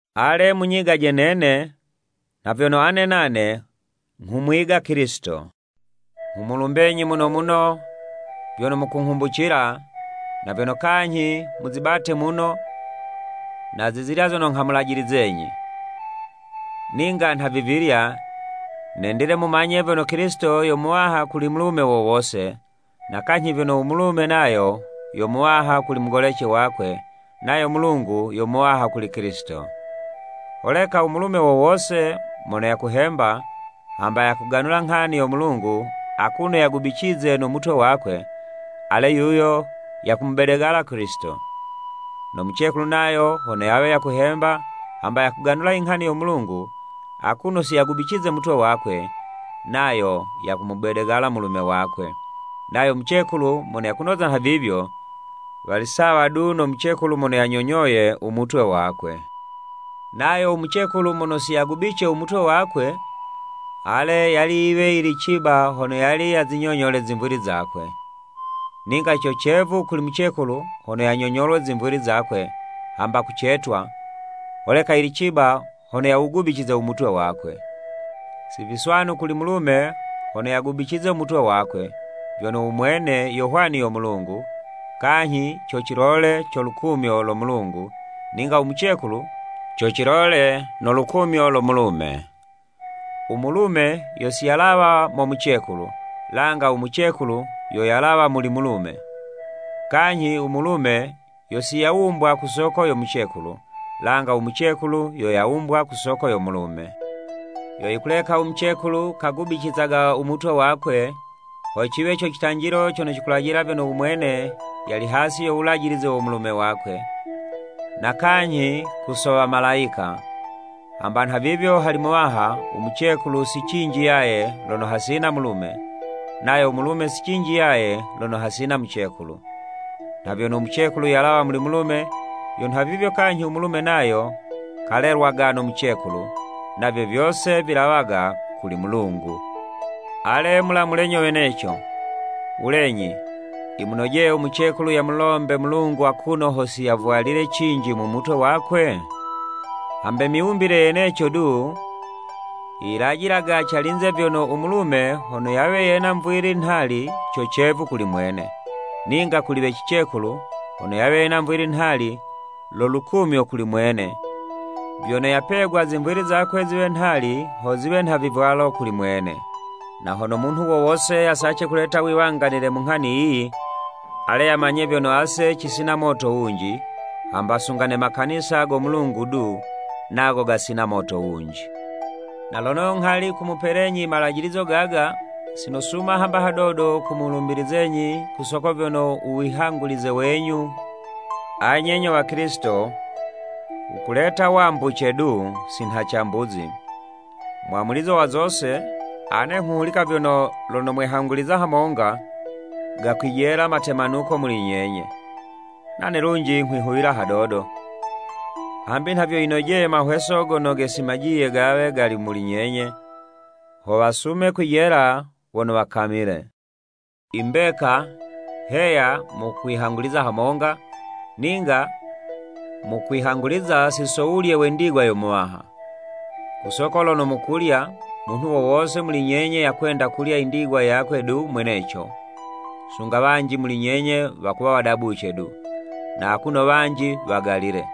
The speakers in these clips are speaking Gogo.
Ale munyigaje nene nha vyono ane nane nghumwiga Kilisito. Nghumulumbenyi muno muno vyono mukunghumbucila, na vyono kanyhi muzibate muno na zizilya zono nghamulajilizenyi. Ninga nhavivilya, nendile mumanye vyono Kilisito yo Muwaha kuli mulume wo wose, na kanyhi vyono u mulume nayo yo muwaha kuli mugolece wakwe nayo Mulungu yo Muwaha kuli Kilisito. Holeka u mulume wo wose mono yakuhemba, hamba yakuganula nghani yo Mulungu akuno yagubicize no mutwe wakwe, ale yuyo yakumubedegala Kilisito. No mucekulu nayo hono yawe yakuhemba hamba yakuganula inghani yo Mulungu akuno si yagubicize mutwe wakwe, nayo yakumubedegala mulume wakwe, nayo mucekulu mono yakunoza nhavivyo, wali sawa du no mucekulu mono yanyonyoye u mutwe wakwe. Nayo u mucekulu mono si yagubice u mutwe wakwe, ale yali yiwe yili ciba hono yali yazinyonyole zimvili zakwe. Ninga co cevu kuli mucekulu hono yanyonyolwe zimvili zakwe, hamba kucetwa, holeka yili ciba hono yawugubicize u mutwe wakwe. Si viswanu kuli mulume hono yagubicize u mutwe wakwe, vyono u mwene yo hwani yo Mulungu, kanyhi co cilole co lukumyo lo Mulungu, ninga u mucekulu, co cilole no lukumyo lo mulume. U mulume yo si yalawa mo mucekulu, langa u mucekulu yo yalawa muli mulume. Kanyhi u mulume yo siyawumbwa ku soko yo mucekulu, langa u mucekulu yo yawumbwa ku soko yo mulume. Yo yikuleka u mucekulu kagubicizaga u mutwe wakwe, ho ciwe co citanjilo cono cikulajila vyono u mwene yali hasi yo wulajilize wo mulume wakwe, na kanyhi ku so Wamalayika. Hamba nhavivyo hali Muwaha, u mucekulu, si cinji yaye lono hasina mulume, nayo u mulume si cinji yaye lono hasina mucekulu. Nha vyono u mucekulu yalawa muli mulume, yo nhavivyo kanyhi u mulume nayo kalelwaga no mucekulu, navyo vyose vilawaga kuli Mulungu. Ale mulamule nyo weneco, wulenyi yimunojeye u mucekulu yamulombe Mulungu akuno ho siyavwalile cinji mu mutwe wakwe? Hambe miwumbile yeneco du yilajilaga calinze vyono u mulume hono yawe yena mvwili nhali co cevu kuli mwene, ninga kuli we cicekulu hono yawe yena mvwili nhali, lo lukumyo kuli mwene, vyono yapegwa zimvwili zakwe ziwe nhali ho ziwe nha vivwalo kuli mwene. Na hono munhu wo wose yasace kuleta wiwanganile mu nghani yiyi, ale yamanye vyono ase cisina moto wunji, hamba sunga ne makanisa go Mulungu du nago gasina moto wunji. Na lono nghali nghumupelenyi i malajilizo gaga, si nosuma hamba hadodo kumulumbizenyi ku soko vyono u wihangulize wenyu anye nyo Wakilisito, wukuleta wambuce du, si nha cambuzi. Mwamulizo wa zose, ane nghuhulika vyono, lono mwehanguliza hamonga, gakwijela matemanuko muli nyenye. Nane kunji nghwihuwila hadodo, hambi nha vyo yinojeye mahweso gono gesimajiye gawe gali muli nyenye ho wasume kwijela wono wakamile. I mbeka, heya mukwihanguliza hamonga, ninga mukwihanguliza si so wulye we ndigwa yo Muwaha! Ku soko lono mukulya, munhu wo wose muli nyenye yakwenda kulya i ndigwa yakwe du mweneco, sunga wanji muli nyenye wakuwa wadabuce du, na akuno wanji wagalile!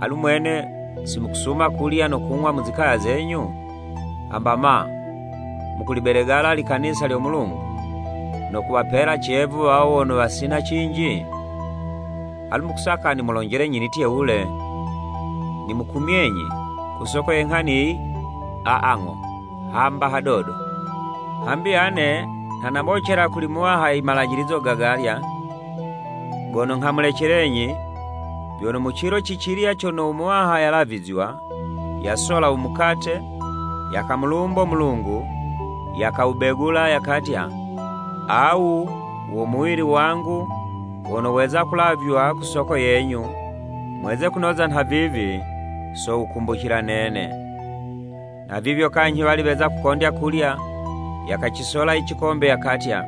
Alu mwene, si mukusuma kulya no kung'wa mu zikaya zenyu? Hamba, ma, mukulibedegala i likanisa lyo Mulungu, no kuwapela cevu wawo wono wasina cinji? Alu mukusaka nimulonjelenyi nitye wule? Nimukumyenyi ku soko ye nghani yiyi? Aa ng'o hamba hadodo! Hambi ane nha nabocela kuli Muwaha i malajilizo gagalya gono nghamulecelenyi, vyono mu cilo ci cilya cono u Muwaha yalavizywa, yasola u mukate, yakamulumbo Mulungu, yakawubegula yakatya, “Awu wo muwili wangu wono weza kulavywa ku soko yenyu mweze kunoza nhavivi, so wukumbucila nene.” Nhavivyo kanyhi wali weza kukondya kulya, yakacisola i cikombe yakatya,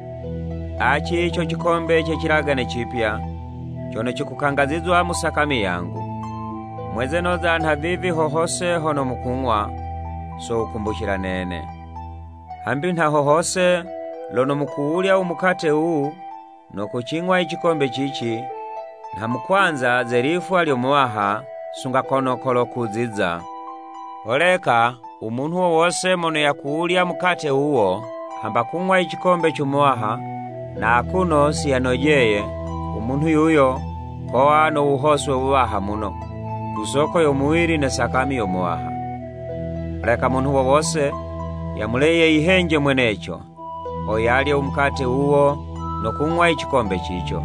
“Aci co cikombe ce cilagane cipya, cono cikukangazizwa mu sakami yangu. Mweze noza nhavivi ho hose lono mukung'wa, so wukumbucila nene.” Hambi nha ho hose lono mukuwulya u mukate wuwu no kucing'wa i cikombe cici, nha mukwanza ze lifwa lyo Muwaha, sunga kono kolo kuziza. Holeka u munhu wo wose mono yakuwulya mukate wuwo, hamba kung'wa i cikombe co Muwaha, na akuno si yanojeye, u munhu yuyo kowa no wuhoswe wuwaha muno, ku soko yo muwili ne sakami yo Muwaha. Holeka munhu wo wose, yamule yeyihenje mweneco, ho yalye u mukate wuwo no kung'wa i cikombe cico,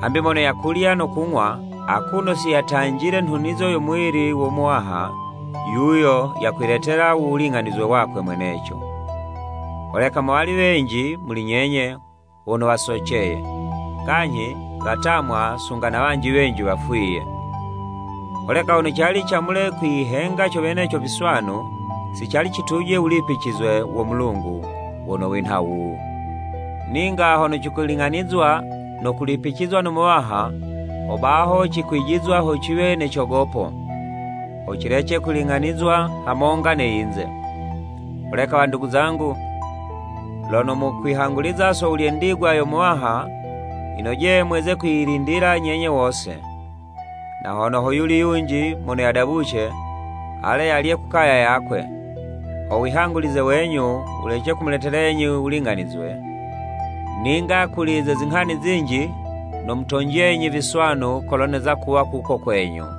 hambi mono yakulya no kung'wa, akuno si yatanjile nhunizo yo muwili wo Muwaha, yuyo yakwiletela u wuling'anizwe wakwe mweneco. Holeka mowali wenji muli nyenye wono wasoceye, kanyhi watamwa sunga na wanji wenji wafwiye. Holeka hono cali camule kwiyihenga co weneco viswanu, si cali cituje wulipicizwe wo Mulungu wono winha wuwu. Ninga lono cikuling'anizwa no kulipicizwa no Muwaha, ho baho cikwijizwa ho ciwe ne cogopo, ho cilece kuling'anizwa hamonga ne yinze. Holeka wandugu zangu, lono mukwihanguliza so wulye ndigwa yo Muwaha, yinojeye mweze kwiyilindila nyenye wose. Na hone ho yuli yunji mono yadabuce, ale, yalye ku kaya yakwe, ho wihangulize wenyu, wulece kumuletelenyi wuling'anizwe. Ninga kuli ze zinghani zinji, nomutonjenyi viswanu kolo neza kuwa kuko kwenyu.